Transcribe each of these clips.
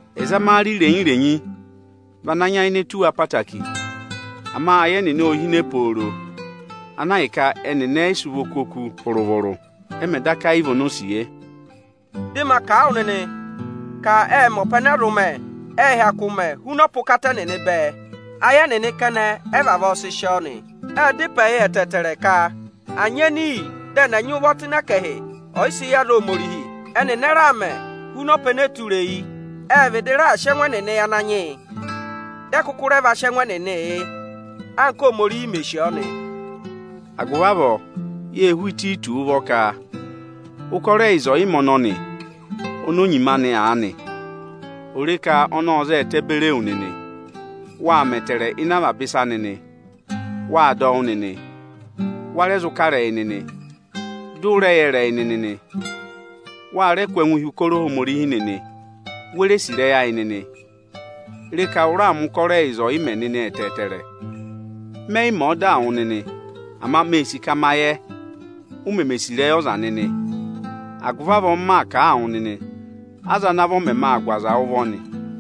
Ẹzamare irenyi-irenyi vị ana nyayịnẹ tù wa ẹtẹẹtẹrẹ. Ama ayị ẹnịnị o yi hine pooro, ana ahịka ẹnịnị ẹ yị sị ụvọ kú oku vụrụ-vụrụ, ẹ mẹ̀ daka yị vị onosiye. Dị ma kà a wụ nịnị ka ẹnịnị ệ mẹ hu ọpa ẹnẹ ẹ zụ mẹ, ệ hyakụ mẹ huna ọpa ụkata ẹnịnị bẹẹ. Ayị ẹnịnị kẹnẹ ẹ vavọọ si sì ọọ nị. Ệ da ịpẹ yị ẹtẹẹtẹrẹ ka à nyị ẹnị iyi dị ẹnị ẹ̀ nyị ụvọ tụ́ ẹkẹhị ọyịsị yị aza Ohomorihi. Ẹnịnị ẹ raà mẹ huna ọpa ẹnẹ ẹyị tụra eyi, ệ vịdị raà sị ẹngụ ẹnịnị yị Ananyị yị, dị ẹ kụkụ va sị ẹngụ ẹnịnị ị nyị, anka Ohomorihi mé sì ọọ. Agụvị avọọ yé hú Ịtayịtọsị ụvọ ụkọrọ ẹyịza ọyịmẹ̀ ọnọnị oni o nyima anị aanị, ò re ka ọnị ọ́ za a ẹtẹ beri ewu nịnị. Waa mẹ ẹtẹẹrẹ ịnị avaba ịsa nịnị. Wâ dọ wụ́ nịnị, wa rẹ zụ kà ịrẹyị nịnị, dị ụ rẹ yẹ ịrẹyị nịnị nị. Wa rẹ kụ́ ẹngụ hi ụkọrọ Ohomorihi nịnị, we re sì ịrẹyị ayị nịnị. Re ka ụ raa mẹ̀ ụkọrọ ẹyịza ọyịmẹ̀ nịnị ẹtẹẹtẹrẹ o. Mẹ yị mẹ̀ ẹ ọdaa wụ nịnị. Ama mee sì ka ma yẹ, u meme sì ịrẹyị ọza nịnị; agụvị avọọ m maa kà a wụ nịnị, aza ana vọ mẹmẹ aa gụ aza ụvọ nị.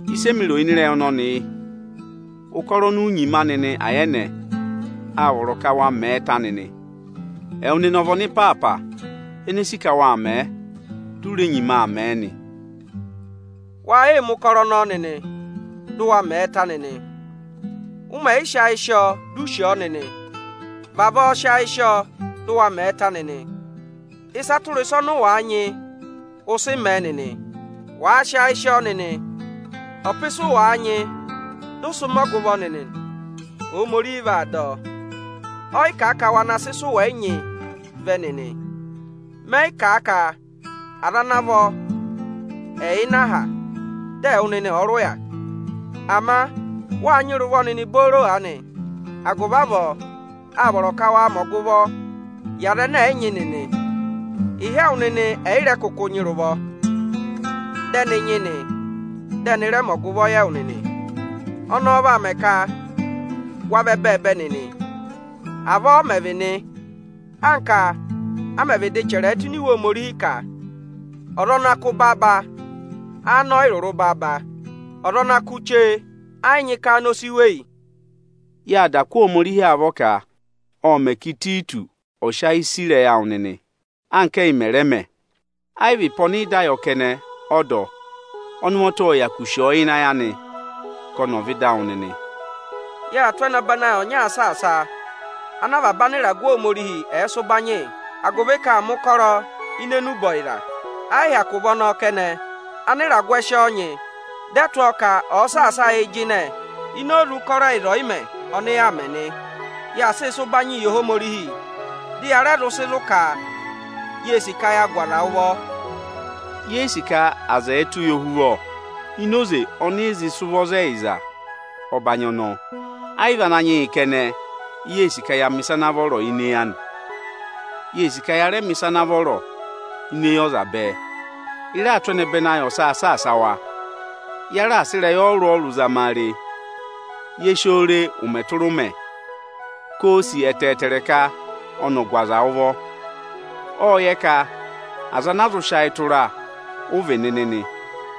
Ịsị emi ro nị ịrẹyị ọnọnị yị: Ụkọrọ oni u nyima anị nịnị ayẹnẹ, â vọrọ ka wa mẹ̀ ẹ ta nịnị. Ẹwụ nịnị ọ vị ọnịpaapa ene sì ka waa mẹ̀ ẹ, di u re nyima aa mẹ̀ ẹ nịnị nị. Wa yịị mẹ̀ ụkọrọ ọnọọ nịnị, dị ụ wa mẹ̀ ẹ ta nịnị! Ụ mẹ̀ sị ayị sị ọọ, di u sì ọọ nịnị, vavọọ sị ayị sị ọọ dị ụ waa mẹ̀ ẹ ta nịnị! Ịsa tụra ịsa ọnị ụ waa nyị, ụ sị mẹ̀ ẹ nịnị. Wàa sị ayị sị ọọ nịnị, ọpa ịsị ụ waa nyị dị ụ sị mẹ ọgụvọ nịnị nị, Ohomorihi vaa dọ. Ọ yị kà a ka wa na sị ịsị ụ wẹ yị nyị vẹ nịnị. Mẹ yị kà a ka aza ana vọ ẹ̀ yà ịnị aha, dị ẹwụ nịnị ọ̀ọ rị ụya. Ama wâ nyị rị ụvọ nịnị booro aanị, agụvị avọọ â vọrọ ka wa mẹ ọgụvọ yị aza ẹnẹ ẹ̀ yị nyị nịnị. Ịhị ẹwụ nịnị ẹ̀ yị rẹ kụkụ nyị rị ụvọ, dị ẹnị nyị nị, dị ẹnị rẹ mẹ ọgụvọ yị ẹwụ nịnị. Ọnọọ vaa mẹ ka wa vị ẹbẹẹbẹ nịnị. Avọọ ọ mẹ̀ vị nị, anka a mẹ̀ vịdị chẹrẹ ẹ tụ́ ini Iwe Ohomorihi ka: Ọza ana kụ́ baaba, aanị ọ yị rụrụ baaba; ọza ana va kụ́ chee ẹ yị nyị ka áanị o si weyi. Yâ kụ́ Ohomorihi avọọ ka ộ mẹ̀ ka Ịtayịtọsị ộ sị ayị sì ịrẹyị awụ nịnị, anka ẹyị mẹ̀ rẹẹ mẹ Ẹ yị vị ịpẹ ọnị ị dá yọ kẹnẹ ọ dọ: ọnị ụvọta ộ hyakụ sì ọọ ịnị ayị anị ka ọnị ọ̀ vẹ ịdị awụ nịnị. Yaa tụ́ ẹnẹbẹnị ayị ọnyaa saasa a ana avaba anịragụ Ohomorihi ẹ̀ẹ sị ụbanyị yị, agụvị ka aa mẹ̀ ụkọrọ enube ọyịza ọyịkà. Ẹ yị hyakụ vị ọnọọ kẹnẹ, anịragụ ẹ sị ọọ nyị, dị ẹ tụ́ ọọ ka ọ̀ọ saasa ayịị jịnẹ ini oze ụkọrọ ẹyịza ọyịmẹ̀ nị ọnị yaa mẹ nị. Yaa sịị sị ụbanyịị yị Ohomorihi, dị ya rẹ sị zụ̀ ka yee sì ka ya gụ aza ụvọ. Ye yi sì ka ya mẹ ka aza ẹ̀ẹ tụ́ yị ohuvọ ini oze ọnị ị zị sị ụvọ za ẹyịza ọbanyị ọnọọ. Ẹ yị vị Ananyị yị kẹnẹ, i yee sì ka ya mẹ̀ ịsa ana vọrọ ini eyi anị. Yee sì ka ya rẹẹ mẹ̀ ịsa ana vọrọ ini eyi ọza bẹẹ. Ị raa tụ́ ẹnẹbẹnị ayị ọsaa saasa wa. Ya raà sị ịrẹyị ọrụrụ-ọrụrụ zama a re, ye si oo re ụmẹ tụra ụmẹ ka oō sì ẹtẹẹtẹrẹ ka ọnị ọ̀ gụ aza ụvọ. Ộ yẹ ka aza ana a zụ sị ayị tụra ụ vị nịnị nị.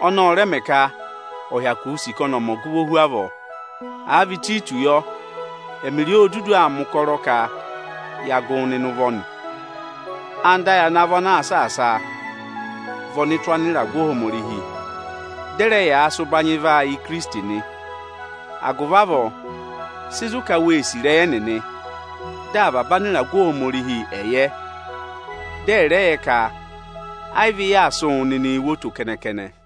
Ọnọọ ọ rẹ mẹ ka ọ̀ hyakụ sì ka ọnị ọ̀ mẹ ọgụvọ hu avọọ. Àa vị Ịtayịtọsị yọ, ẹmịrị ọ, o dudu aa mẹ̀ ụkọrọ ka ya gụ wụ nịnị ụvọ nị. Anda ayị ana vọ ana saasa a, vị ọnụtụ anịragụ Ohomorihi, dị ẹ rẹ yaa sị ụbanyị vaa yị Ikirisiti nị. Agụvị avọọ, sị zụ̀ ka wee sì ịrẹyị ẹnịnị, dị avaba anịragụ Ohomorihi ẹ̀ yẹ. Dị ẹ̀ rẹ yẹ ka ẹ yị vị ị yaa sị wụ nịnịị wo oto kẹnẹ-kẹnẹ.